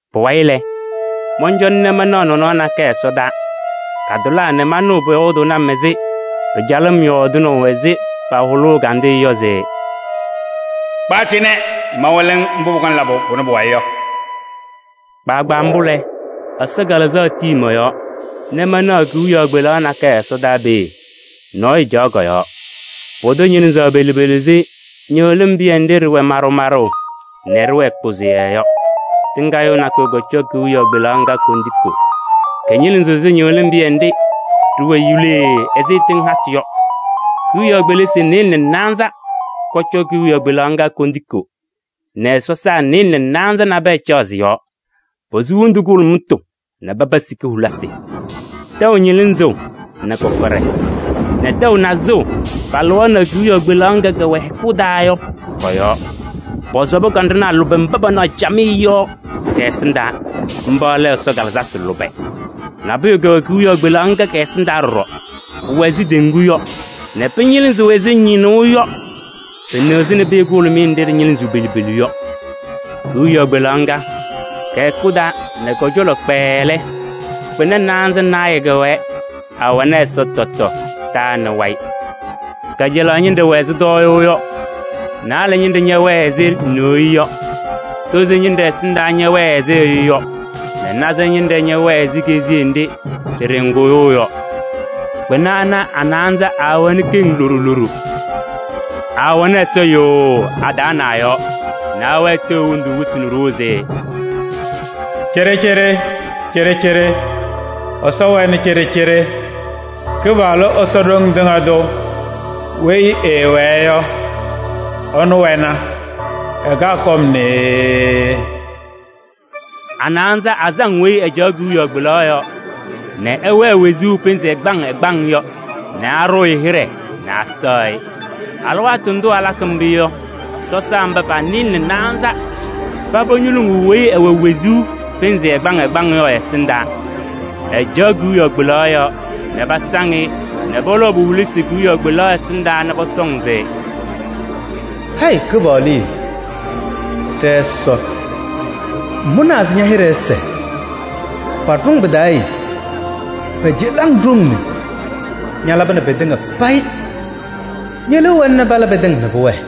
Pʋwayɩ lɛ, mɔncɔna nɛ manaɣ nɔnɔɔ nakɛyɛ ɛsɔdaa, katʋlaa nɛ manɩɣ pʋyɔɔdʋʋnɩ-m ɛzɩ pɩcalʋʋ-m yɔɔdɩnaʋ ɛzɩ pahʋlʋʋ ɛgandɩyɛ yɔ se: “Kpa cɩnɛ nɛ mawɩlɩ-ŋ mbʋ pʋkɔŋ labʋ pʋnɛ pʋ-wayɩ yɔ.” Kpaagbaa mbʋ lɛ, Ɛsɔ Kalɩzaɣ tii mɔ-yɔɔ nɛ manaɣ kewiyaɣ kpelaɣ nakɛyɛ ɛsɔdaa peeye. Nɔɔyʋ caɣ kɔ-yɔɔ. Pʋdʋ ñɩlɩzaɣ pelu pelu ɛzɩ ñɩɣlɩm pɩyɛ nɖɩ ɖɩwɛ maɖʋ maɖʋ nɛ ɖɩwɛɛ kpʋzʋyɛɛ yɔ. Tɩŋgaɣyʋʋ nakʋyʋ kɔcɔ kewiyaɣ kpelaɣ ŋga kondiko. Kɩñɩlɩzɩɣ ɛzɩ ñɩɣlɩm pɩyɛ nɖɩ ɖɩwɛ yuulee ɛzɩ tɩŋ hatʋ yɔ. Kewiyaɣ kpelisi nɩɩlɛ nɛ naanza kɔcɔ kewiyaɣ kpelaɣ ŋga kondiko nɛ sɔsaa nɩɩlɛ nɛ naanza nabɛyɛ caɣ sɩ-yɔɔ. Posu wondu kʋhʋlʋmʋtʋ nɛ paba sika hulisi. Tɛʋ ñɩlɩzʋʋ nɛ kɔkɔɖɛ nɛ tɛʋ nazʋʋ palɩɣaɣnɩ kewiyaɣ kpelaɣ ŋga kɛwɛ hɛkʋ taa yɔ kɔ-yɔɔ. Pɔsɔbɩ kanɖʋnaa lʋbɛ mba panaɣ camɩyɛ yɔ kɛ-ɛsɩndaa: mba lɛ Ɛsɔ kalɩzasɩ lʋbɛ. Nabʋyʋ kɛwɛ kewiyaɣ kpelaɣ ŋga kɛ-ɛsɩndaa ɖɔɖɔ. Pʋwɛ ɛzɩ teŋgu yɔ nɛ pɩñɩlɩzɩɣ ɛzɩ ñɩñʋʋ yɔ. Pɩnɩɣzɩnɩ pɩyɛ kʋhʋlʋmɩyɛ nɖɩ ɖɩñɩlɩzɩɣ pelu pelu yɔ. Kewiyaɣ kpelaɣ ŋga, kɛ-hɛkʋ taa nɛ kɔ-cɔlɔ kpɛɛɛ lɛ, kpɩna naanza naayɛ kɛwɛɛ, awɛnɩ ɛza tɔtɔ, taa nɛ wayɩ. Kajalaɣ ñɩnɖɛ wɛ ɛzɩ tɔɔyʋʋ yɔ, naalɛ ñɩnɖɛ ñɛwɛɛ ɛzɩ neɣye yɔ, tozo ñɩnɖɛ ɛsɩndaa ñɛwɛɛ ɛzɩ ɛyʋ yɔ nɛ naza ñɩnɖɛ ñɛwɛɛ ɛzɩ keziye nɖɩ ɖɩɖɔŋ kʋyʋʋ yɔ. Kpɩna ana, a-naanza aawɛnɩ keŋ loɖo loɖo. Aawɛnɩ ɛza yʋʋʋ a-taa nɛ a-yɔɔ nɛ awɛɛ ateɣ hendu wɩsɩ nɛ ɖoo se: “Cɩɖɩcɩɖɩ, cɩɖɩcɩɖɩ Ɛsɔ wɛnɩ cɩɖɩcɩɖɩ. Kɩpaɣlʋ Ɛsɔ Ɖoŋ Tɩŋa Tʋ weyi ɛɛwɛɛ yɔ, ɛnʋ wɛna, ɛkaɣ kɔm nee.” A-naanza asaŋ weyi ɛcaɣ kewiyaɣ kpelaɣ yɔɔ nɛ ɛwɛɛ wezuu pɩnzɩ ɛgbaŋ ɛgbaŋ yɔ nɛ aɖʋʋ-ɩ hɩɖɛ nɛ asɛɣ-ɩ. Alɩwaatʋ ndʋ alakɩ mbʋ yɔ, sɔsaa mba pa-nɩɩlɛ nɛ naanza paba ñoluŋuu weyi ɛwɛ wezuu pɩnzɩ ɛgbaŋ ɛgbaŋ yɔ ɛ-ɛsɩndaa. Ɛcaɣ kewiyaɣ kpelaɣ yɔɔ nɛ pasaŋ-ɩ nɛ pɔlɔʋ po-hulisi kewiyaɣ kpelaɣ ɛsɩndaa nɛ pɔtɔŋ se: “Hayɩ Kɩpaɣlʋ yee, ɖɛ-Ɛsɔ, ŋmʋnaa se ña-hɩɖɛ ɛsɛɛ, paɖʋ-ŋ pɩ-taa yee pɛcɛlɩ-ŋ ɖoŋ nee. Ñalabɩnɩ pɩtɩŋa payɩ ñe-liu wɛna nɛ pala pɩtɩŋa nɛ pʋwɛɛ.”